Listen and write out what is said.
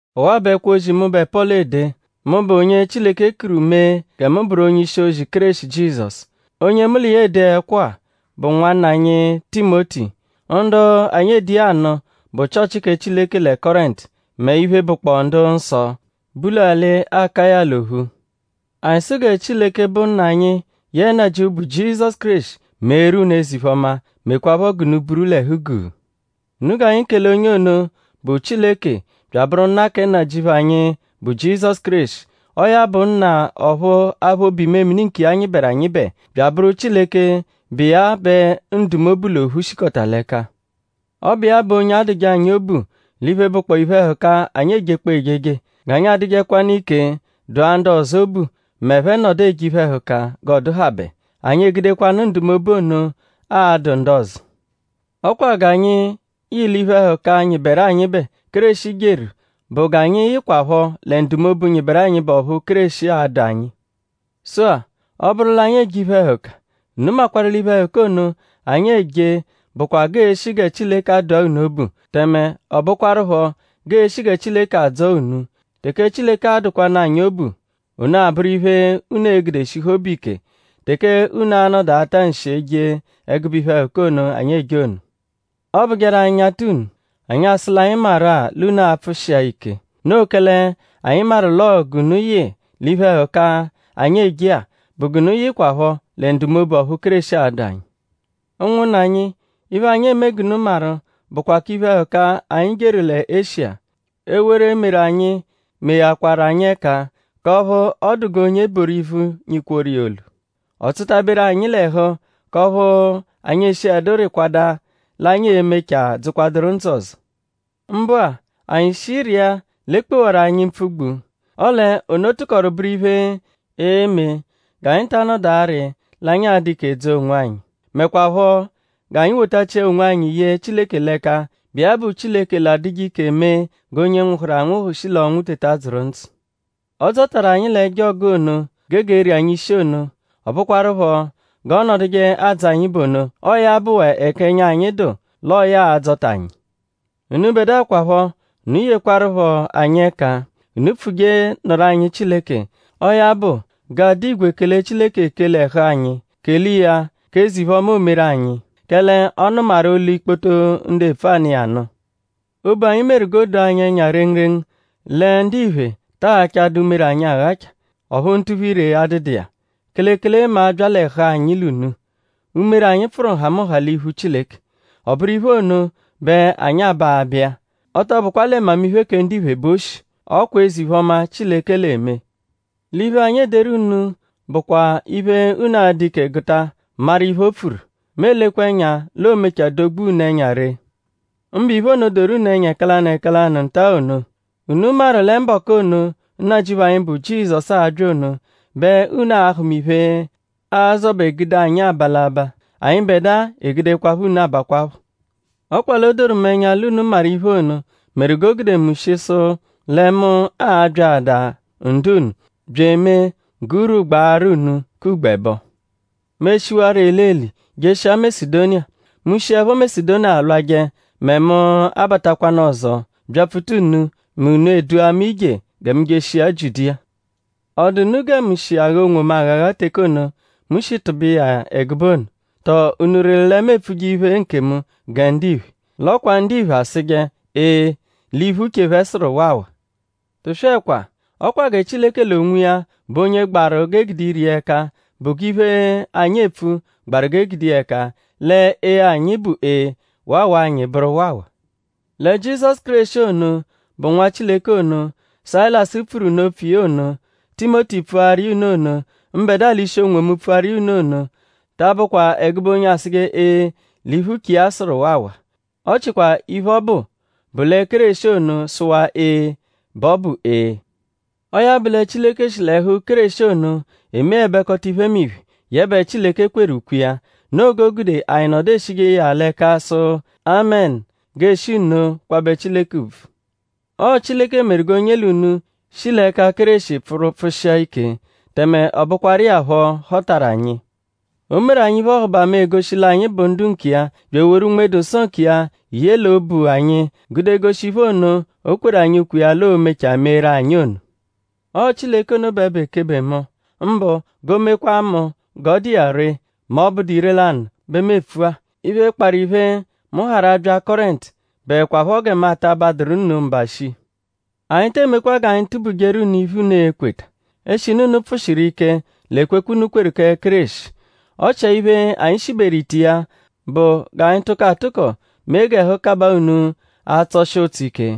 Ọwa-a bụ ẹkwo-ozi, mụbe Pọlu ede; mụbe onye Chileke kuru mee gẹ mu bụru onye-ishi-ozi Kéreshi Jizọsu. Onye mu l'iya ede ẹkwo-a bụ nwanna anyi Timoti. Ndu anyi ede iya anụ bụ Chịochi kẹ Chileke lẹ Kọrentu mẹ iphe, bụkpoo ndu-nsọ, bu l'alị Akaya l'ophu. Anyi sụ gẹ Chileke, bụ Nna anyi yẹe Nnajịuphu, bụ Jizọsu Kéreshi meeru unu eze-iphe-ọma; mekwaaphọ g'unu buru l'ẹhu-guu. Unu g'anyi kele onye ono, bụ Chileke bya abụru Nna kẹ Nnajịuphu anyi, bụ Jizọsu Kéreshi. Ọo ya bụ Nna ọphu aphụ obu-imemini nkiya nyịberu anyịbe; bya abụru Chileke, bụ iya bẹ ndumobu l'ophu shikọta l'ẹka. Ọ bụ iya bụ onye adụje anyi obu l'iphe, bụkpoo iphe-ẹhuka, anyi ejekpọo ejeje; g'anyi adụkwanu ike dụa ndu ọzo obu m'ẹphe -nọdu eje iphe-ẹhuka g'ọ dụhabe. Anyi egudekwanụ ndumobu ono adụ ndu ọzo. L'ọ kwa g'anyi yị l'iphe-ẹhuka, nyịberu anyịbe, Kéreshi jeru bụ g'anyi yịhukwapho lẹ ndumobu, nyịberu anyịbe ọphu Kéreshi adụ anyi. Sụ-a; ọ -bụru l'anyi eje iphe-ẹhuka; unu makwarụ l'iphe-ẹhuka ono, anyi eje bụkwa g'ee-shi gẹ Chileke adụa unu obu; tẹme ọ bụkwarupho g'ee-shi gẹ Chileke adzọo unu. Teke Chileke adụkwanu anyi obu; ono abụru iphe, unu e-gude shihu obu ike teke unu a-nọdu ata nshi eje ẹgube iphe-ẹhuka ono, anyi eje ono. Ọobujeru anyi -nyata unu; anyi asụ l'anyi maru-a l'unu a-pfụshia ike. Noo kẹle anyi maru l'ọo g'unu yị l'iphe-ẹhuka, anyi eje-a bụ g'unu yịhukwapho lẹ ndumobu ọphu Kéreshi adụ anyi. Ụnwunna anyi; iphe, anyi eme g'unu maru bụkwa k'iphe-ẹhuka, anyi jeru lẹ Eshiya. Ewere, meru anyi meghakwaru anyi ẹka k'ọphu ọ dụ g'onye e boru ivu, nyị-kworu iya olu. Ọ tsụta-beru anyi l'ẹhu k'ọphu anyi eshiẹdu rịkwadaa l'anyi e-mechaa dzụkwaduru ndzụ ọzo. Mbụ-a; anyi shi rịa l'e kpewaru anyi mpfugbu; ọle ono tụkoru bụru iphe, e-me g'anyi ta anọdu arị l'anyi a-dụ ike dzọo onwanyi; mekwaaphọ g'anyi wotachia onwanyi ye Chileke l'ẹka, bụ iya bụ Chileke l'adụje ike mee g'onye nwụhuru anwụhu shi l'ọnwu teta dzụru ndzụ. Ọ dzọtaru anyi l'ẹjo ọgu ono, gege eri anyi ishi ono. Ọ bụkwarupho g'ọo-nọduje adzọ anyi bụ ono. Ọo ya bụwaa ẹka ẹnya anyi dụ l'ọo ya a-dzọta anyi. Unubẹdua kwaphọ; unu yekwarụpho anyi ẹka; unu pfuje nụru anyi Chileke. Ọo ya bụ; g'aa-dụ igwe kele Chileke ekele ẹhu anyi; kele iya k'eze-iphe-ọma, o meru anyi; kẹle ọ nụmaru olu ikpoto ndu epfu anụ iya nụ. Obu anyi meru g'o doo anyi ẹnya rengurengu lẹ ndiphe ta aghachadu umere anyi aghacha; ọphu ntuphu-ire adụdu iya; kelekele mẹ a -bya l'ẹhu anyi l'unu. Umere anyi pfụru nhamụnha l'iphu Chileke. Ọ bụru iphe ono bẹ anyi aba aba iya. Ọ tọ bụkwa lẹ mmamiphe kẹ ndiphe bẹ o shi; ọ kwa eze-iphe-ọma, Chileke l'eme. L'iphe, anyi ederu unu bụkwa iphe, unu a-dụ ike gụta maru iphe, o pfuru. Mu elekwa ẹnya l'oo-mechaa dogbua unu ẹnya ree; mbụ iphe ono, doru unu ẹnya ẹka lanụ ẹka lanụ nta-a ono. Unu maru lẹ mbọku ono, Nnajịuphu anyi, bụ Jizọsu a-bya ono bẹ unu a-hụma iphe, a-zọbe gude anyi aba l'abaa; anyịbedua egudekwaphọ unu abakwaphọ. Ọ kwa l'o doru mu ẹnya l'unu maru iphe ono; meru g'o gude mu shi sụ lẹ mu a-byaadaa ndu-unu bya emee g'urwu gbaarụ unu k'ugbo ẹbo. Mu eshiwarọ elieli jeshia Masedoniya. Mu -shiẹpho Masedoniya lwajẹ mẹ mu abatakwanụ ọzo byapfuta unu mẹ unu edua mu ije gẹ mu jeshia Jiudiya. ?Ọ dụ unu gẹ mu shi agha onwomu aghagha teke ono, mu shi tụbe iya ẹgube ono??Tọo unu rịru lẹ mu epfuje iphe nkemu gẹ ndiphe. L'ọ kwa ndiphe asụje: Ee l'iphe, uche phẹ sụru: Waawa. Tụswekwa! Ọ kwa gẹ Chileke l'onwiya bụ onye gbaru g'e gude ire iya ẹka bụ g'iphe, anyi epfu gbaru g'e gude iya ẹka lẹ Ee anyi bụ Ee; Waawa anyi bụru Waawa. Lẹ Jizọsu Kéreshi ono, bụ Nwa Chileke ono, Sayilasu pfuru unu opfu iya ono; Timoti pfuaru iya unu ono; mbẹdua l'ishi onwomu pfuaru iya unu ono ta abụkwa ẹgube onye asụje Ee l'iphe, uche iya sụru Waawaa. Ọ chikwaa iphe, ọ bụ bụ lẹ Kéreshi ono -sụwaa Ee bẹ ọ bụ Ee. Ọo ya bụ lẹ Chileke shi l'ẹhu Kéreshi ono emeẹbekota iphemiphe, yẹbe Chileke kweru ukwe iya. Noo g'o gude anyi nọdu eshije iya l'ẹka sụ “Amẹnu”; g'ee-shi nno kwabẹ Chileke ùbvù. Ọo Chileke meru g'onye l'unu shi l'ẹka Kéreshi pfụru pfụshia ike; tẹme ọ bụkwaru iya phọ họtaru anyi. O meru anyi iphe-ọhubama, egoshi l'anyi bụ ndu nkiya bya eworu Unme-dụ-Nsọ nkiya ye l'obu anyi gude goshi iphe ono, o kweru anyi ukwe iya l'oo-mechaa meeru anyi ono. Ọo Chileke ono bẹ bụ ekebe mu. Mbụ; g'o mekwaa mu g'ọ dụ iya ree mẹ ọ -bụdu ire-lanụ bẹ mu epfu-a: Iphe, kparụ iphe, mu harụ abya Kọrentu bụekwapho gẹ mu ata abadụru unu mba shii. Anyi te emekwa g'anyi tubujeru unu iphe, unu e-kweta; eshinu unu pfụ-shiru ike l'ekwekwe, unu kweru kẹ Kéreshi. Ọ chia iphe, anyi shiberu ite iya bụ g'anyi tụko atụko mee g'ẹhu kabaa unu atsọ-shi ụtso ike.